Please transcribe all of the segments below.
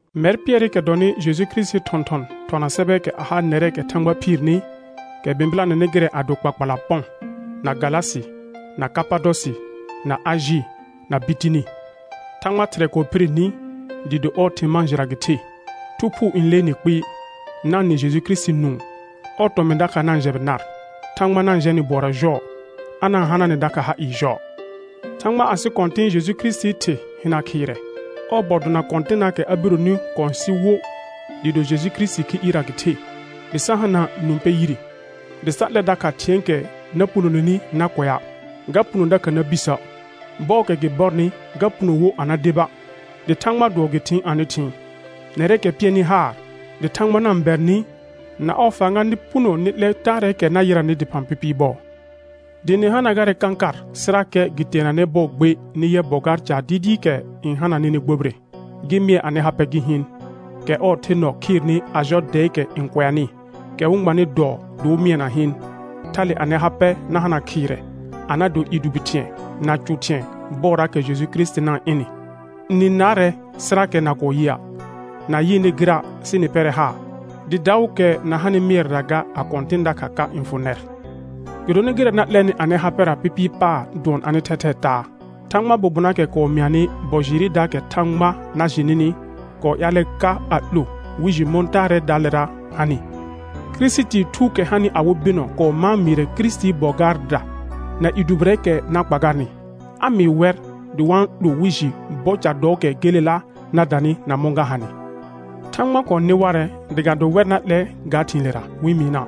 Mɛr Pɩɛrɩkɛ dɔnɩ Jeju Kirisitii thɔ̃thɔn thɔna sɛbɛɛkɛ a ha nɛrɛɛkɛ Thãgba phiirni, kɛ bɩ̃bɩlanɛnɩ gɩrɛ a do kpakpala Pɔ̃, na Galasɩ, na Kapadɔsɩ, na Ajɩ, na Bitini. Thãgba Thɩrɛ kɔɔ phire ni dɩɩ do ɔɔ thɩ̃ mãa jɩra gɩ ɩhe, Thu Phuu n lee nɩ kpɩɩ, na-n nɩ Jeju Kirisiti nũu, ɔɔ tɔmɩ̃ dakha na-n jɛbɩ nar. Thãgba na-n jɛ nɩ bʋɔra jɔɔ, a na-n hana nɩ dakha ha ɩɩ jɔɔ. Thãgba asɩ Kɔ̃tɩ̃ Jeju Kirisitii Thɩ hɩna khɩɩrɛ, ɔɔ bɔ dona kɔ̃tɩnaakɛ a bironi kɔ̃ sɩ wo dɩɩ do Jeju Kirisitii khi ɩɩrra gɩ the, dɩ sa hana nũ pɛ yire, dɩ sa 'lɛ dakha thɩ̃ɛɛkɛ na punoneni na kʋɛa', ga puno dakha na bisə', bɔɔkɛ gɩ bɔrnɩ ga puno wo a na deba', dɩ Thãgbaa dʋɔ gɩ thɩɩn anɩ thɩɩn, nɛrɛɛkɛ pɩɛrnɩ haar dɩ Thãgba na-n bɛr nɩ na ɔɔ fãga nɩ puno nɩ 'lɛ taarɛɛkɛ na yɩranɩ dɩphã pɩpɩɩ bɔɔ. Dɩ nɩ hana garɛ kãkar sɩrakɛ gɩ teenanɛ bɔɔ gbe nɩ yɛ bɔ gaar caar dɩɩdɩɩkɛ n hana nɩnɩ gbobire, gɩ mɩɛ anɩ ha pɛ gɩ hɩɩn, kɛ ɔɔ the nɔ khɩɩrnɩ a jɔ dɛɛkɛ n kʋɛanɩ, kɛ wɩ-n gbanɩ dɔɔ dɩ wɩ mɩɛna hɩɩn, thale anɩ ha pɛ na hana khɩɩrɛ, a na do i dʋbɩ thɩ̃ɛ, na cʋ thɩ̃ɛ bɔɔraakɛ Jeju Kirisiti na-n mɩ. Nɩ-n naarɛ sɩrakɛ na kɔɔ yɩa', na yɩɩnɩ gɩra', sɩ nɩ pɩɛrɛ haar, dɩ daʋʋkɛ na hanɩ mɩɛrɛra ga a kɔ̃tɩ̃ dakha ka n fʋ nɛr; gɩdonɩ gɩrɛ na 'lɛnɩ anɩ ha pɛra pɩpɩɩ paar dʋɔn anɩ thɛthɛɛ taa. Thãgbaa bobonaakɛ kɔɔ mɩanɩ bɔ jɩɩrɩdaakɛ Thãgba na jɩ nɩnɩ, kɔɔ ƴaalɛ ka a 'lo wɩ jɩ mɔ̃ taarɛɛdaalera hanɩ. Kirisitii Thuukɛ hanɩ awɩ bɩnɔ kɔɔ mãa mɩɩrɛ Kirisitii bɔ gaarda na i dʋbɩrɛɛkɛ na kpa garnɩ, a mɩɩ wɛr dɩ wa-n 'lo wɩ jɩ bɔ ca dɔɔkɛ gelela na danɩ na mɔ̃ ga hanɩ. Thãgba kɔɔ nɩ warɛ dɩ ga do wɛr na 'lɛ ga thɩ̃ɩlera wɩ-n mɩɩna',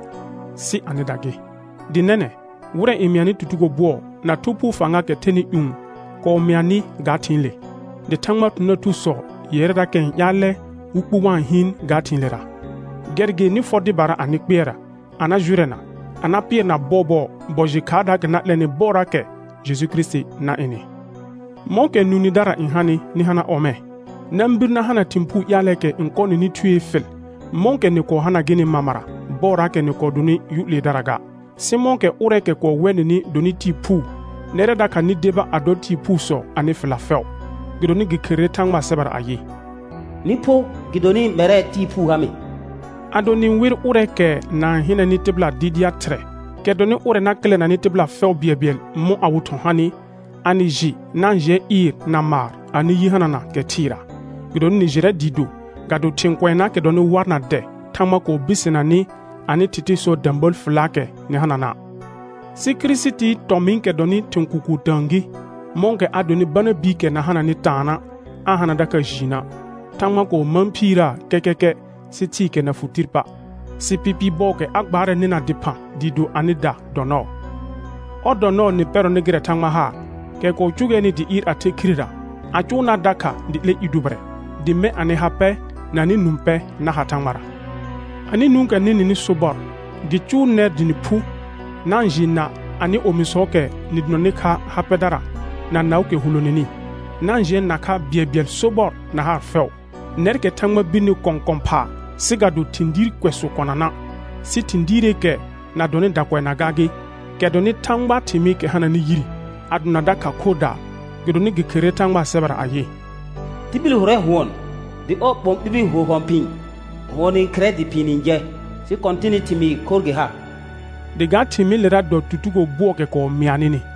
sɩ anɩda gɩ. Dɩ nɛnɛ̃, wɩrɛ n mɩanɩ tutugo bʋɔ na Thu Phuu fãgaakɛ thɛnɩ ƴũ kɔɔ mɩa nɩ ga thɩ̃ɩle. Dɩ Thãgbaa thɔ̃thɔ̃daar thusɔ yɛrɛrakɛ n ƴaalɛ wɩ kpu wa-n hɩɩn ga thɩ̃ɩlera. Gɛr gɩ nɩ fɔ dɩbara anɩ kpɩɛrra, a na jʋrɛna, a na pɩɛrna bɔɔbɔɔ bɔ jɩ khaardaakɛ na 'lɛnɩ bɔɔraakɛ Jeju Kirisiti na ɩnɩ. Mɔ̃kɛ nũ nɩdara n hanɩ, nɩ hana ɔmɛ̃. Na-n bir na hana thɩ̃ puu ƴaalɛɛkɛ n kɔɔ kɔ nɩnɩ thuee fɩl, mɔ̃kɛ nɩ kɔɔ hana gɩnɩ mamara bɔɔraakɛ nɩ kɔɔ donɩ yʋ 'leedara ga. Sɩ mɔ̃kɛ ʋrɛɛkɛ kɔɔ wɛ nɩnɩ donɩ Tɩɩ phuu, nɛrɛ dakha nɩ deba a dɔ tɩɩ phuusɔ anɩ fɩlla fɛʋ. Gɩdonɩ gɩ kherere Thãgbaa sɛbɛra ayɩ: «Nɩ pho gɩdonɩ mɛrɛ Tɩɩ phuu ha mɩ.» Ado nɩ-n wer ʋrɛɛkɛ na-n hɩnɛnɩ tɩbɩla dɩɩdɩa' Thɩrɛ, kɛ dɔnɩ ʋrɛ na kɩlɛnanɩ tɩbɩla fɛʋ bɩɛlbɩɛl mɔ̃ awɩ thɔ̃ hanɩ, a nɩ jɩ na-n jɩɛ ɩɩr na maar anɩ yi hanana kɛ thɩɩra. Gɩdonɩ nɩ jɩrɛ dɩɩ do, ga do thɩ̃ kʋɛnaakɛ dɔnɩ war na dɛ Thãgba kɔɔ birsena nɩ anɩ thɩthɩsɔɔ də̃bəəl fɩllaakɛ nɩ hanana', sɩ Kirisitii tɔmɩ̃ɩkɛ dɔnɩ thɩ̃ kʋkʋʋ tə̃ə gɩ, mɔ̃kɛ a donɩ bana biikɛ na hananɩ taana', aa hana dakha jiinə'. Thãgba kɔɔ mãa phiirəə kɛkɛkɛ sɩ thɩɩkɛ na fʋ tir pa', sɩ pɩpɩɩ bɔɔkɛ a gbaarɛ nɩna dɩphã dɩɩ do anɩda dɔ nɔɔ. Ɔr dɔ nɔɔ nɩ pɛrɔnɩ gɩrɛ Thãgba haar, kɛ kɔɔ cʋgɛɛnɩ dɩ ɩɩr a the khirera, a cʋʋnaa dakha dɩ 'lɛ i dʋbɩrɛ, dɩ mɛ̃ anɩ ha pɛ na anɩ nũ pɛ na ha Thãgbara. Anɩ nũukɛ nɩ-n nɩnɩ sobɔr, gɩ cʋʋ nɛr dɩ nɩ phu na-n jɩɩ na anɩ omisɔɔkɛ nɩ donanɩ kha ha pɛdara na naʋʋkɛ huloneni; na-n jɩɛ na kha bɩɛlbɩɛl sobɔr na haar fɛʋ, nɛrkɛ Thãgba birni kɔ̃ kɔ̃ phaa sɩ ga do thɩ̃ diir kʋɛsʋ kɔna na', sɩ thɩ̃ diireekɛ na dɔnɩ dakʋɛnaa gaa gɩ, kɛ dɔnɩ Thãgbaa thɩmɩɩkɛ hananɩ yire, a dona dakha khorrdaa. Gɩdonɩ gɩ kherere Thãgbaa sɛbɛra ayɩ: «Tibil hʋrɛ hʋɔn, dɩ ɔɔ ɓɔ̃ ɓibi ho hɔ̃ phɩ̃ɩ. Hʋɔn n khɩrɛ dɩ phɩ̃ɩ n jɛ, sɩ Kɔ̃tɩnɩ thɩmɩɩ khorr gɩ ha.» Dɩ ga thɩmɩɩlera dɔ tutugo bʋɔɔkɛ kɔɔ mɩa nɩnɩ.